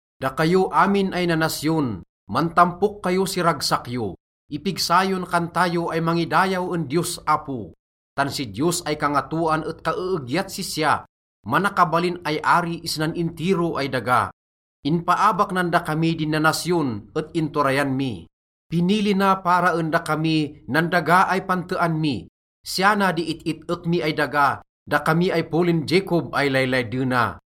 Dakayo amin ay nanasyon, mantampok kayo si ragsak yo. Ipigsa yon kanta yo ay mangidayaw en Diyos Apo. Tan si Diyos ay Kangatoan et kaeegyat sisya, manakabalin ay ari isnan intiro ay daga. Inpaabak nan dakami din nanasyon et inturayan mi. Pinili na para en dakami nan daga ay pantean mi. Siya na di it-it-ek mi ay daga, dakami ay polin Jacob ay laylaydena.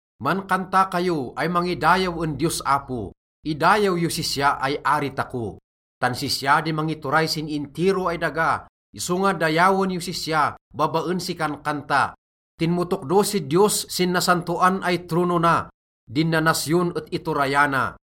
Mankanta kayo ay mangidayaw en Diyos Apo, idayaw yos sisya ay ari tako. Tan sisya di mangituray sin intiro ay daga, isonga dayawen yos sisya babaen si kankanta. Tinmotokdo si Diyos sin nasantoan ay trono na. Din nanasyon et iturayana.